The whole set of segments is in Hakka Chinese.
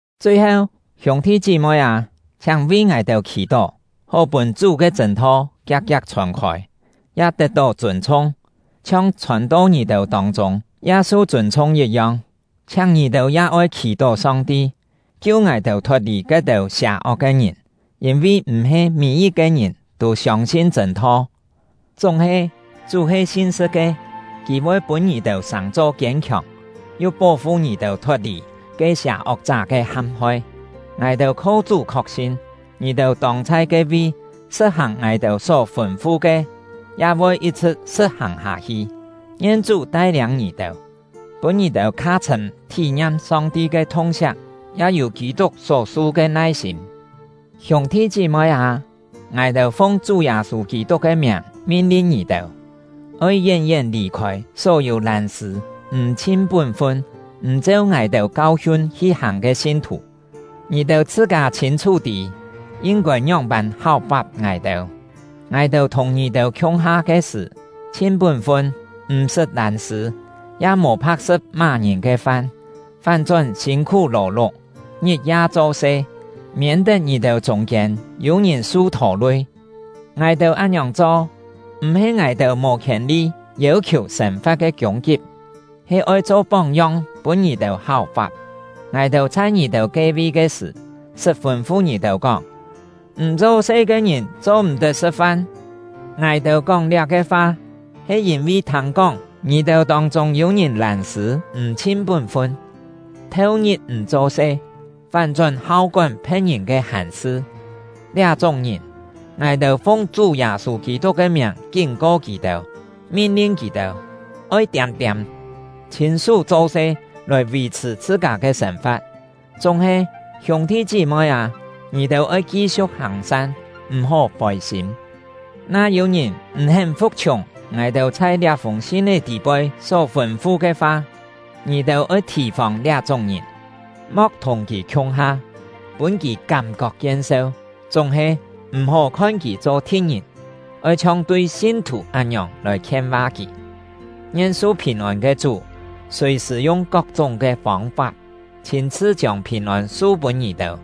Chui-heu, hiûng-thi chí-moi â, chhiáng vi ngài-têu khì-tó, hó-pûn Chú ke chṳ̂n-tho kiak-kiak chhòn-khôi, ya tet-tó chûn-chhung, chhiong chhòn-to ngì-têu tông-chûng ya su chûn-chhung yit-yong. Chhiáng ngì-têu ya oi khì-tó Song-ti, kiu ngài-têu thot-lì ke-têu sià-ok ke ngìn, yîn-vi m̀-he mî-yit-ke ngìn tû siông-sin chṳ̂n-tho. Chúng-he, Chú he sin-sṳ̍t ke; Kì voi pûn ngì-têu sàng-cho kiên-khiòng, yu pó-fu ngì-têu thot-lì ke sià-ok-chá ke ham-hoi. Ngài-têu kho Chú khok-sin, ngì-têu tông chhai ke-vi sṳ̍t-hàng ngài-têu só fûn-fu ke, ya voi yit-chhṳ̍t sṳ̍t-hàng hâ-hi. Ngien Chú tai-liâng ngì-têu, pûn ngì-têu kha chhṳ̂m thí-ngiam Song-ti ke thung-siak, ya yû Kî-tuk só-su ke nai-sîm. Hiûng-thi chí-moi â, ngài-têu fung Chú Yâ-sû Kî-tuk ke miàng min-lin ngì-têu: Oi yén-yén lì-khôi só-yû lân-sṳ̂ m̀ chhin pún-fun, m̀ cheu ngài-têu kau-hiun hi-hàng ke sin-thù. Ngì-têu chhṳ-kâ chhîn-chhú tî, yin-kôi ngióng-pân háu-fap ngài-têu. Ngài-têu thùng ngì-têu khiung-ha ke sṳ̀, chhin pún-fun, m̀-sṳt lân-sṳ̂, ya mò pha̍k-sṳ̍t má-ngìn ke fan; fán-chón sîn-khú lò-luk, ngit-ya cho-se, miên-tet ngì-têu chûng-kiên yû-ngìn su thô-lui. Ngài-têu án-ngiòng cho, m̀-he ngài-têu mò khièn-li yêu-khiù sên-fa̍t ke kiûng-kip, he oi cho póng-yong pûn ngì-têu háu-fap. Ngài-têu chhai ngì-têu ke-vi ke sṳ̀, sṳt fûn-fu ngì-têu kóng: “M̀ cho-se ke ngìn cho-m̀-tet sṳ̍t-fan.” Ngài-têu kóng liá-ke fa, he yîn-vi thâng-kóng ngì-têu tông-chûng yû ngìn lân-sṳ̂ m̀ chhin pún-fun, theu-ngit m̀ cho-se, fán-chón hau kón phe̍t-ngìn ke hàn-sṳ. Liá-chúng ngìn, ngài-têu fung Chú Yâ-sû Kî-tuk ke miàng kín-ko kì-têu, min-lin kì-têu, oi tiâm-tiâm, chhîn-sú cho-se lòi vì-chhṳ̀ chhṳ-kâ ke sên-fa̍t. Chúng-he, hiûng-thi chí-moi â, ngì-têu oi ki-siu̍k hàng-san, m̀-hó fôi-sîm. Na yû-ngìn m̀-hén fu̍k-chhiùng ngài-têu chhai liá-fûng sin-é tî-poi só fûn-fu ke fa, ngì-têu oi thì-fòng liá-chúng ngìn, mo̍k thùng kì khiung-ha, pûn kì kám-kok kien-seu. Chúng-he, m̀-hó khon kì cho thi̍t-ngìn; oi chhiong tui sin-thù án-ngiòng lòi khien-va kì. Ngien su phìn-ôn ke Chú, sùi-sṳ̀ yung kok-chúng ke fông-fap, chhîn-chhṳ chiông phìn-ôn su-pûn ngì-têu!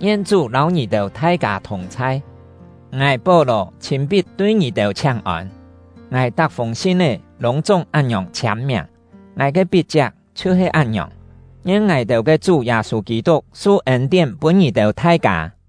Ngien Chú lâu ngì-têu thai-kâ thùng-chhai! Ngài — Pó-lò chhîn-pit tui ngì-têu chhiáng-ôn. Ngài tak-fûng sin-é lûng-chúng án-ngiòng chhiâm-miàng; ngài ke pit-chiak chhiu-he án-ngiòng. Ngien ngài-têu ke Chú Yâ-sû Kî-tuk su ên-tién pûn ngì-têu thai-kâ!